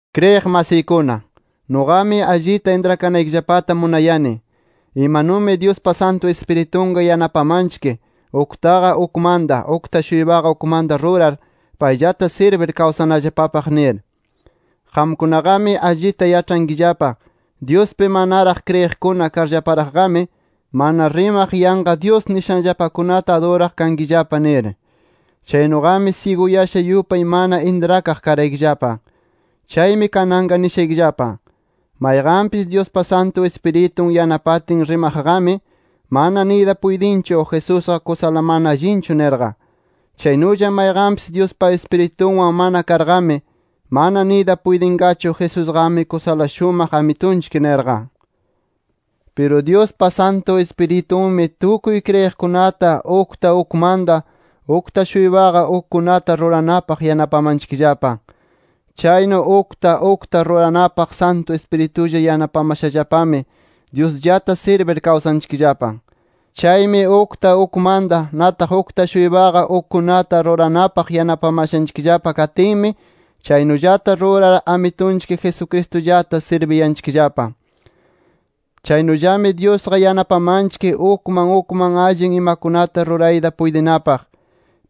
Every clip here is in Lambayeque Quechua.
Kriyiq masiykuna, nuqami allita intrakanaykillapata munayani, imanumi Dyuspa Santu Ispiritunqa yanapamanchik uktaqa ukmanta, ukta-shuypaqa ukmanta rurar, payllata sirbir kawsanallapapaq nir. Qamkunaqami allita yaĉhankillapa, Dyuspi manaraq kriyiqkuna karllaparaqqami, mana rimaq yanqa dyus nishanllapakunata aduraq kankillapa nir. Chaynuqami, syiguyasha yupay mana intrakaq karaykillapa. Chaymi kananqa nishaykillapa: Mayqanpis, Dyuspa Santu Ispiritun yanapatin rimaqqami, mana niyta puytinchu, ¡Jesusqa kusala mana allinchu! nirqa. Chaynulla mayqanpis Dyuspa Ispiritunwan mana karqami, mana niyta puytinqachu, ¡Jesusqami kusala shumaq Amitunchik! nirqa. Piru Dyuspa Santu Ispiritunmi tukuy kriyiqkunata ukta ukmanta, ukta-shuypaqa ukkunata ruranapaq, yanapamanchikllapa. Chaynu ukta ukta ruranapaq Santu Ispiritulla yanapamashallapami, Dyusllata sirbir kawsanchikllapa. Chaymi ukta ukmanta, nataq ukta-shuypaqa ukkunata ruranapaq yanapamashanchikllapa katinmi chaynullata rurar, Amitunchik Jesucristullata sirbiyanchikllapa. Chaynullami Dyusqa yanapamanchik ukman ukman allin imakunata rurayta puytinapaq.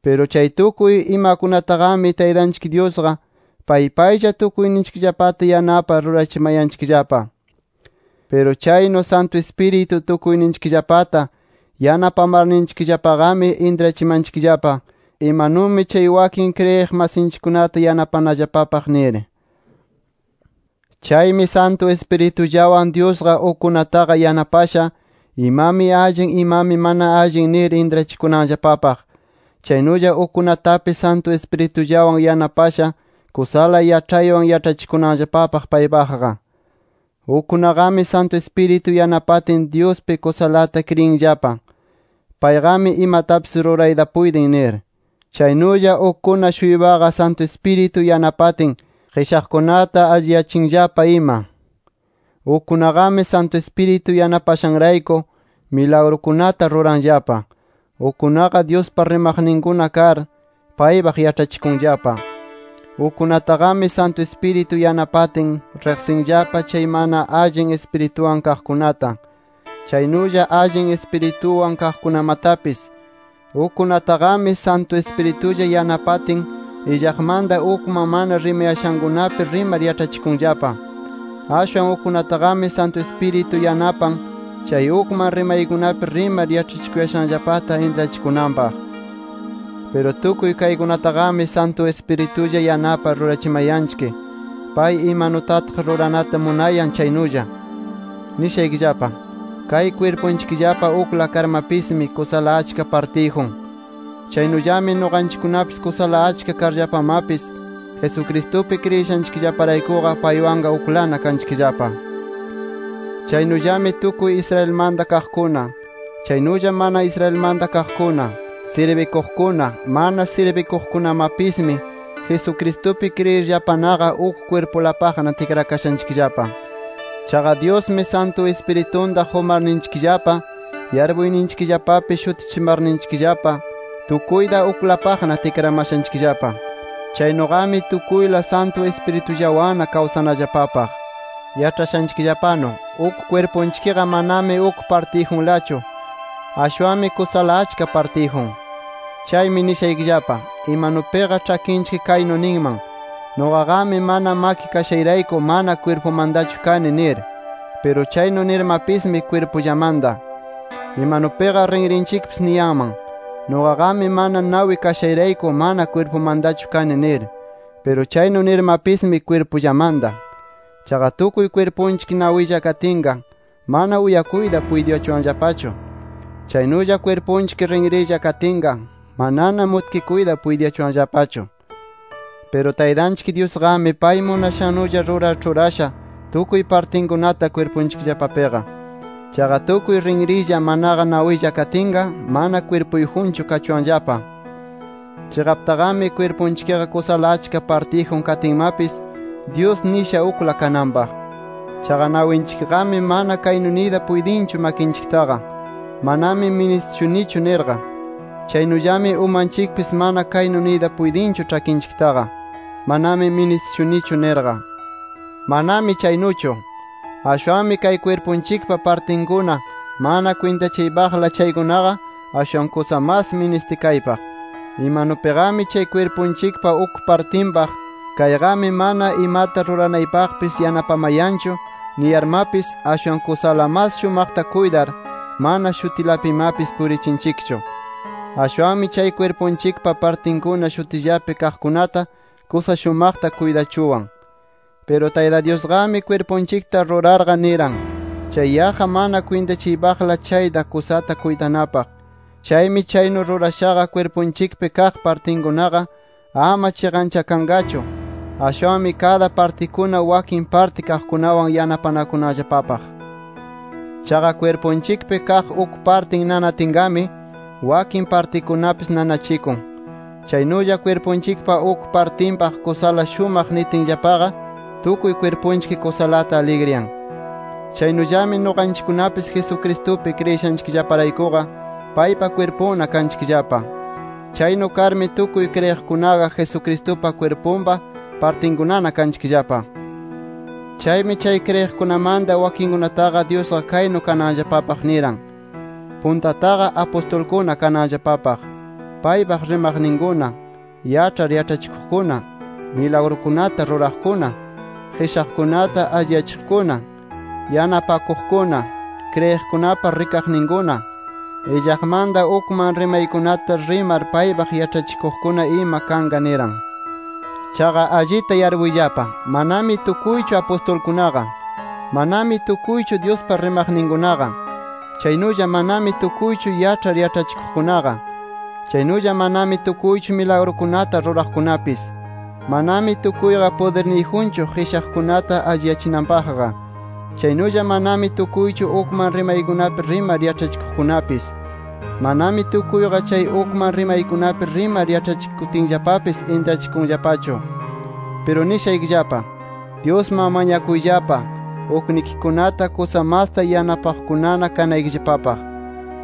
Piru chay tukuy imakunataqami, Taytanchik Dyusqa pay paylla tukuyninchikllapata yanapar rurachimayanchikllapa. Piru chaynu Santu Ispiritu tukuyninchikllapata yanapamarninchikllapaqami, intrachimanchikllapa imanumi chay wakin kriyiq masinchikkunata yanapanallapapaq nir. Chaymi Santu Ispiritullawan Dyusqa ukkunataqa yanapasha, imami allin, imami mana allin nir intrachikunanllapapaq. Chaynulla ukkunatapis Santu Ispiritullawan yanapasha kusala yaĉhaywan yaĉhachikunanllapapaq paypaqqa. Ukkunaqami, Santu Ispiritu yanapatin Dyuspi kusalata kriyinllapa, payqami imatapis rurayta puytin nir. Chaynulla ukkuna-shuypaqa, Santu Ispiritu yanapatin qishaqkunata alliyachinllapa ima. Ukkunaqami, Santu Ispiritu yanapashanrayku milagrukunata ruranllapa, ukkunaqa Dyuspaq rimaqninkuna kar, paypaq yaĉhachikunllapa. Ukkunataqami, Santu Ispiritu yanapatin, riqsinllapa chay mana allin ispirituwan kaqkunata, chaynulla allin Ispirituwan kaqkunamatapis. Ukkunataqami, Santu Ispiritulla yanapatin illaqmanta ukman mana rimayashankunapi rimar yaĉhachikunllapa. Ashwan ukkunataqami, Santu Ispiritu yanapan chay ukman rimaykunapi rimar yaĉhachikushanllapata intrachikunanpaq. Piru tukuy kaykunataqami, Santu Ispiritulla yanapar rurachimayanchik, pay imanutataq ruranata munayan chaynulla. Nishaykillapa: Kay kwirpunchikllapa ukla karmapismi, kusala achka partiyjun. Chaynullami nuqanchikkunapis kusala achka karllapamapis, Jesucristupi kriyishanchikllaparaykuqa, paywanqa uklana kanchikllapa. Chaynullami, tukuy Israelmanta kaqkuna, chaynulla mana Israelmanta kaqkuna, sirbikuqkuna, mana sirbikuqkunamapismi, Jesucristupi kriyirllapanaqa uk kwirpulapaqna tikrakashanchikllapa. Chaqa Dyusmi Santu Ispiritunta qumarninchikllapa yarpuyninchikllapapi shutichimarninchikllapa, tukuyta uklapaqna tikramashanchikllapa. Chaynuqami tukuyla, Santu Ispiritullawanna kawsanallapapaq. Yaĉhashanchikllapanu, uk kwirpunchikqa manami uk partiyjunlachu, ashwanmi kusala achka partiyjun. Chaymi nishaykillapa: Imanupiqa ĉhakinchik kaynu ninman: Nuqaqami mana maki kashayrayku mana kwirpumantachu kani nir. Piru chaynu nirmapismi kwirpullamanta. Imanupiqa rinrinchikpis niyanman: Nuqaqami mana nawi kashayrayku, mana kwirpumantachu kani nir. Piru chaynu nirmapismi, kwirpullamanta. Chaqa tukuy kwirpunchik nawilla katinqa, mana uyakuyta puytiyachuwanllapachu. Chaynulla kwirpunchik, rinrilla katinqa, manana mutkikuyta puytiyachuwanllapachu. Piru Taytanchik Dyusqami, pay munashannulla rurar ĉhurasha tukuy partinkunata kwirpunchikllapapiqa. Chaqa tukuy rinrilla, manaqa nawilla katinqa, mana kwirpuyjunchu kachuwanllapa. Chiqaptaqami, kwirpunchikqa kusala achka partiyjun katinmapis Dyus nisha ukla kananpaq. Chaqa nawinchikqami, mana kaynu niyta puytinchu makinchiktaqa: Manami ministishunichu nirqa. Chaynullami umanchikpis, mana kaynu niyta puytinchu ĉhakinchiktaqa: Manami ministishunichu nirqa. ¡Manami chaynuchu! Ashwanmi kay kwirpunchikpa partinkuna mana kwintachaypaqla chaykunaqa, ashwan kusa mas ministikaypaq. Imanupiqami chay kwirpunchikpa uk partinpaq, “Kayqami mana imata ruranaypaqpis yanapamayanchu” niyarmapis, ashwan kusala shumaqta kuytar, mana shutilapimapis purichinchikchu. Ashwanmi chay kwirpunchikpa partinkuna shutillapi kaqkunata kusa shumaqta kuytachuwan. Piru Tayta Dyusqami, kwirpunchikta rurarqa niran, chay yaqqa mana kwintachaypaqla chayta kusata kuytanapaq. Chaymi chaynu rurashaqa kwirpunchikpi kaq partinkunaqa ama chiqanchakanqachu. Ashwanmi kada partikuna wakin parti kaqkunawan yanapanakunanllapapaq. Chaqa kwirpunchikpi kaq uk partin nanatinqami, wakin partikunapis nanachikun. Chaynulla kwirpunchikpa uk partinpaq kusala shumaq nitinllapaqa, tukuy kwirpunchik kusalata aligriyan. Chaynullami nuqanchikkunapis Jesucristupi kriyishanchikllaparaykuqa, paypa kwirpunna kanchikllapa. Chaynu karmi tukuy kriyiqkunaqa Jesucristupa kwirpunpa partinkunana kanchikllapa. Chaymi chay kriyiqkunamanta wakinkunataqa Dyusqa kaynu kananllapapaq niran: Puntataqa apustulkuna kananllapapaq, paypaq rimaqninkuna, yaĉhar yaĉhachikuqkuna, milagrukunata ruraqkuna, qishaqkunata alliyachiqkuna, yanapakuqkuna, kriyiqkunapa rikaqninkuna, illaqmanta ukman rimaykunata rimar paypaq yaĉhachikuqkuna ima kanqa niran. Chaqa allita yarpuyllapa. Manami tukuychu apustulkunaqa. Manami tukuychu Dyuspa rimaqninkunaqa. Chaynulla manami tukuychu yaĉhar yaĉhachikuqkunaqa. Chaynulla manami tukuychu milagrukunata ruraqkunapis. Manami tukuyqa pudirniyjunchu qishaqkunata alliyachinanpaqqa. Chaynulla manami tukuychu ukman rimaykunapi rimar yaĉhachikuqkunapis. Manami tukuyqa, chay ukman rimaykunapi rimar yaĉhachikutinllapapis intrachikunllapachu. Piru nishaykillapa: Dyusman mañakuyllapa, uknikikunata kusa masta yanapaqkunana kanaykillapapaq.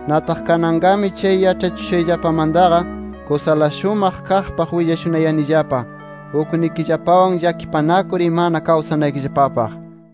Nataq kananqami chay yaĉhachishushayllapamantaqa kusala shumaq kaqpaq willashunayanillapa, uknikillapawan llakipanakur imana kawsanaykillapapaq.